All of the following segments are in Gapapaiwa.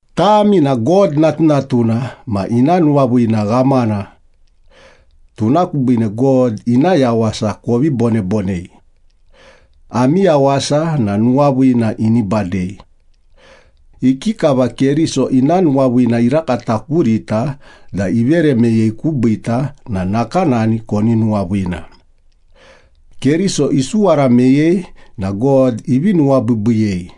Tami na God natunatuna ma ina nuwaviina ghamana. Tuna kubiine God ina yawasa kovi bonebonei. Ami yawasa na nuwaviina ini badei. Ikikava Keriso ina nuwaviina irakata kurita da ivere meyei kubiita na nakanani koni nuwaviina. Keriso isuwara meyei na God ivi nuwabiibiiyei,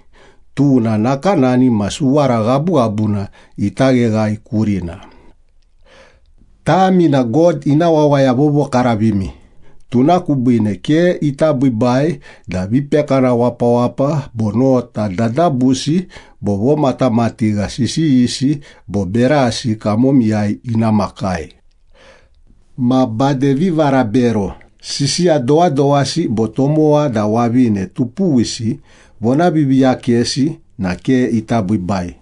tuna nakanani ma suwara ghabughabuna ita gheghae kurina. Tami na God ina wawaya vovokaravimi, tuna kubiine ke ita biibai da vipekana wapawapa bo nota dadabusi bo vomatamatigha sisiyisi bo berasi kamomiyai ina makai. Ma bade vivarabero, sisiya dowadowasi bo tomowa da wavine tupuwisi vonaviiviiyakesi na ke ita biibai.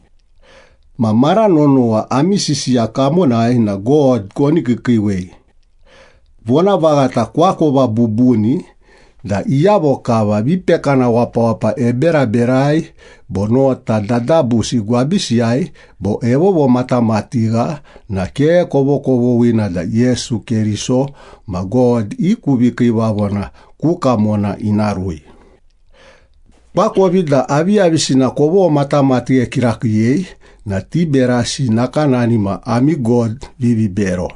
Ma mara nonowa ami sisiya kamonai na God koni kiikiiwei. Vonavaghata koakova bubuni da iyavo kava vipekana wapawapa eberaberai bo nota dadabusi gwabisiyai bo evovomatamatigha na ke kovokovoghina da Yesu Keriso ma God i ku vikiivavona ku kamona ina rui. Koakovi da aviyavisina komatamatigha kirakiiyei na ti berasi nakanani ma ami god vivibero.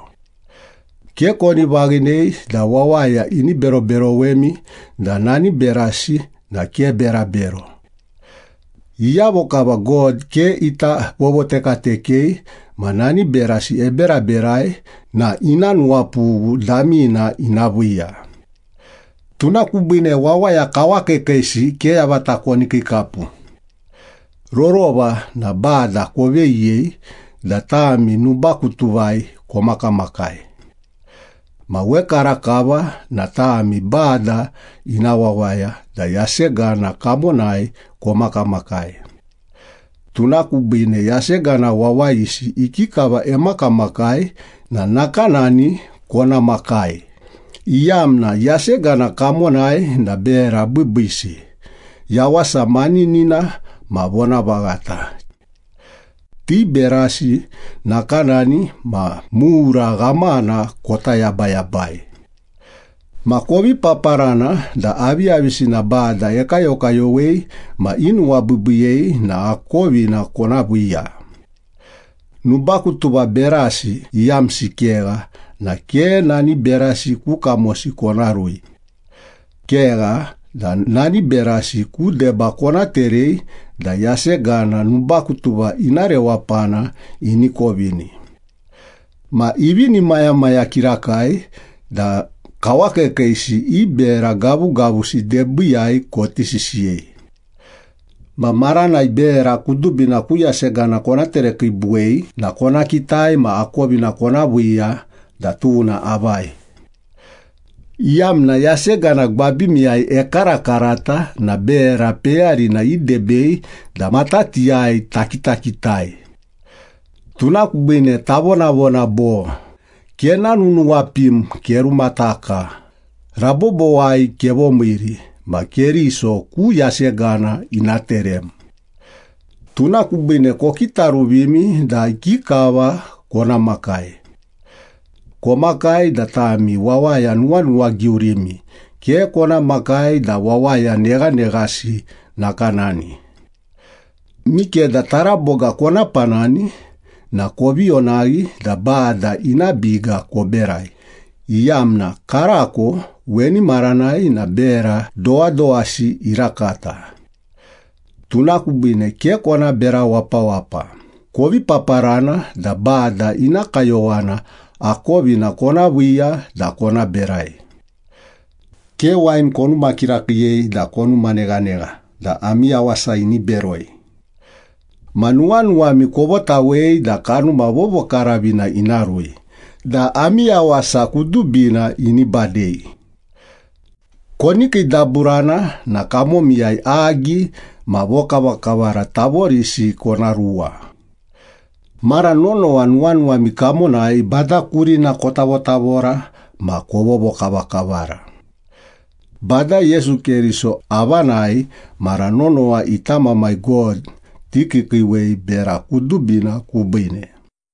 Ke koni vaghinei da wawaya ini beroberowemi da nani berasi na ke berabero. Iyavo kava God ke ita vovotekatekei ma nani berasi eberaberai na ina nuwapughu damina ina viiya. Tuna kubiine wawaya kawakiikiisi ke yavata koni kiikapu. Rorova na Bada koveyiyei da tami nubakutuvai komakamakai. Ma wekarakava na tami Bada ina wawaya da yasegana kamonai komakamakai. Tuna kubiine yasegana wawayisi ikikava emakamakai na nakanani kona makai, iyamna yasegana kamonai na bera biibiisi, yawasa maninina ma vonavaghata. Ti berasi nakanani ma mura ghamana kota yabayabai. Ma kovi paparana da aviyavisina Bada ekayokayowei ma inuwabiibiiyei na akovina kona viiya. Nubakutuva berasi iyamsi kegha na ke nani berasi ku kamosi kona rui. Kegha da nani berasi ku deba kona terei da yasegana nubakutuva ina rewapana ini kovini. Ma ivinimayamaya kirakai da kawakiikiisi i bera gavugavusi debiiyai koti sisiyei. Ma maranai bera kudubina ku yasegana kona terekiibuwei na kona kitai ma akovina kona viiya da tuna avai, iyamna yasegana gwabimiyai ekarakarata na bera peyarina idebei da matatiyai takitakitai. Tuna kubiine tavonavona bo, “Kenanunuwapim, kerumataka! Rabobowai kevomiiri, ma Keriso ku yasegana ina terem.” Tuna kubiine kokitaruvimi da ikikava kona makai. Komakai da tami wawaya nuwanuwagiurimi, ke kona makai da wawaya neghaneghasi nakanani. Mikeda taraboga kona panani na kovi onaghi da Bada ina biga koberai, iyamna karako weni maranai na bera dowadowasi irakata. Tuna kubiine ke kona bera wapawapa, kovi paparana da Bada ina kayowana akovina kona viiya da kona berai. Ke wain konuma kirakiiyei da konuma neghanegha da ami yawasa ini beroi. Ma nuwanuwami kovotawei da Kanuma Vovokaravina ina rui da ami yawasa kudubina ini badei. Koni kiidaburana na kamomiyai agi ma vokavakavara tavorisi kona ruwa. Mara nonowa nuwanuwami kamonai Bada kurina kotavotavora ma kovovokavakavara. Bada Yesu Keriso avanai mara nonowa ita Mamai God tikiikiiwei bera kudubina kubiine.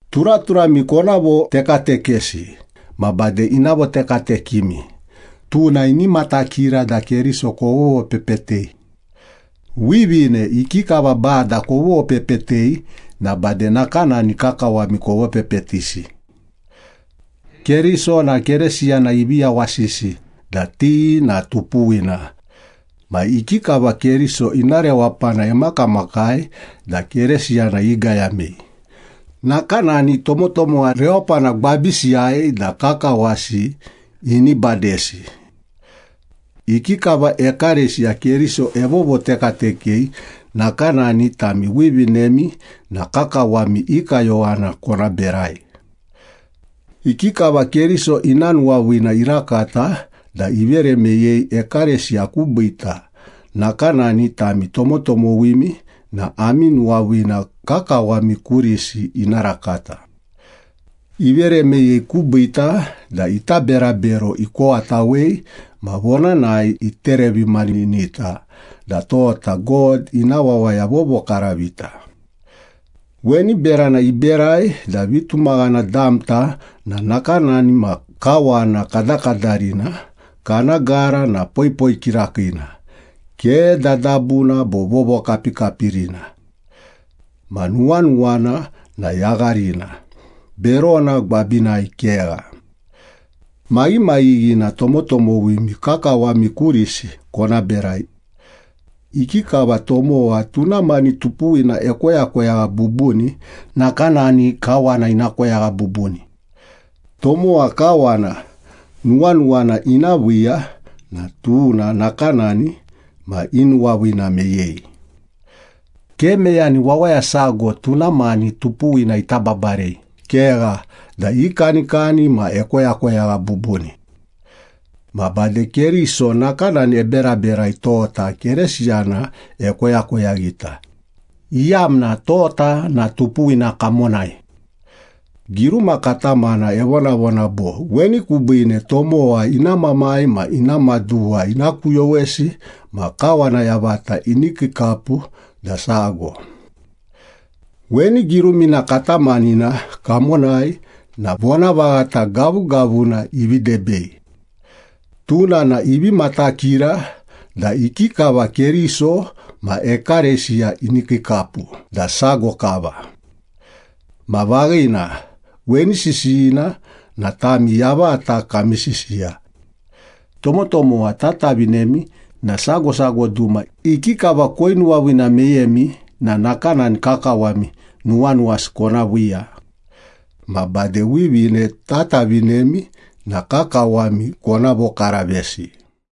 Turaturami kona votekatekesi ma bade ina votekatekemi, tuna ini matakira da Keriso kovovopepetei. Wivine, ikikava Bada kovovopepetei na bade nakanani kakawami kovopepetisi. Keriso na Keresiyana ivi yawasisi da ti na tupuwina. Ma ikikava Keriso ina rewapana emakamakai da Keresiyana igayamei, nakanani tomotomowa rewapana gwabisiyai da kakawasi ini badesi. Ikikava ekalesiya Keriso evovotekatekei, nakanani tami wivinemi na kakawami i kayowana kona berai. Ikikava Keriso ina nuwaviina irakata da ivere meyei ekalesiya kubiita, nakanani tami tomotomowimi na ami nuwaviina kakawami kurisi ina rakata. Ivere meyei kubiita da ita berabero ikowatawei ma vonanai iterevimaninita da tota God ina wawaya vovokaravita. Weni berana iberai da vitumaghana damta na nakanani ma kawana kadakadarina, kana gara na poipoi kirakiina, ke dadabuna bo vovokapikapirina. Ma nuwanuwana na yagharina, berona gwabinai kegha. Maghimaghighina tomotomowimi kakawami kurisi kona berai. Ikikava tomowa tuna mani tupuwina ekoyakoyagha bubuni, nakanani kawana ina koyagha bubuni. Tomowa kawana nuwanuwana ina viiya na tuna nakanani ma inuwaviina meyei. Ke meyani wawaya sago tuna mani tupuwina ita babarei, kegha da ikanikani ma ekoyakoyagha bubuni. Ma bade Keriso nakanani eberaberai, tota Keresiyana ekoyakoyaghita, iyamna tota na tupuwina kamonai. Giruma katamana evonavona bo, “Weni kubiine tomowa ina mamai ma ina maduwa ina kuyowesi ma kawana yavata ini kiikapu da sago.” Weni girumina katamanina kamonai na vonavaghata gavugavuna ivi debei. Tuna na ivi matakira da ikikava Keriso ma ekalesiya ini kiikapu da sago kava. Ma vaghina, weni sisiyina na tami yavata kami sisiya. Tomotomowa tatavinemi na sago sago duma ikikava koinuwaviina meyemi na nakanani kakawami nuwanuwasi kona viiya. Ma bade wivine tatavinemi na kakawami kona vokaravesi.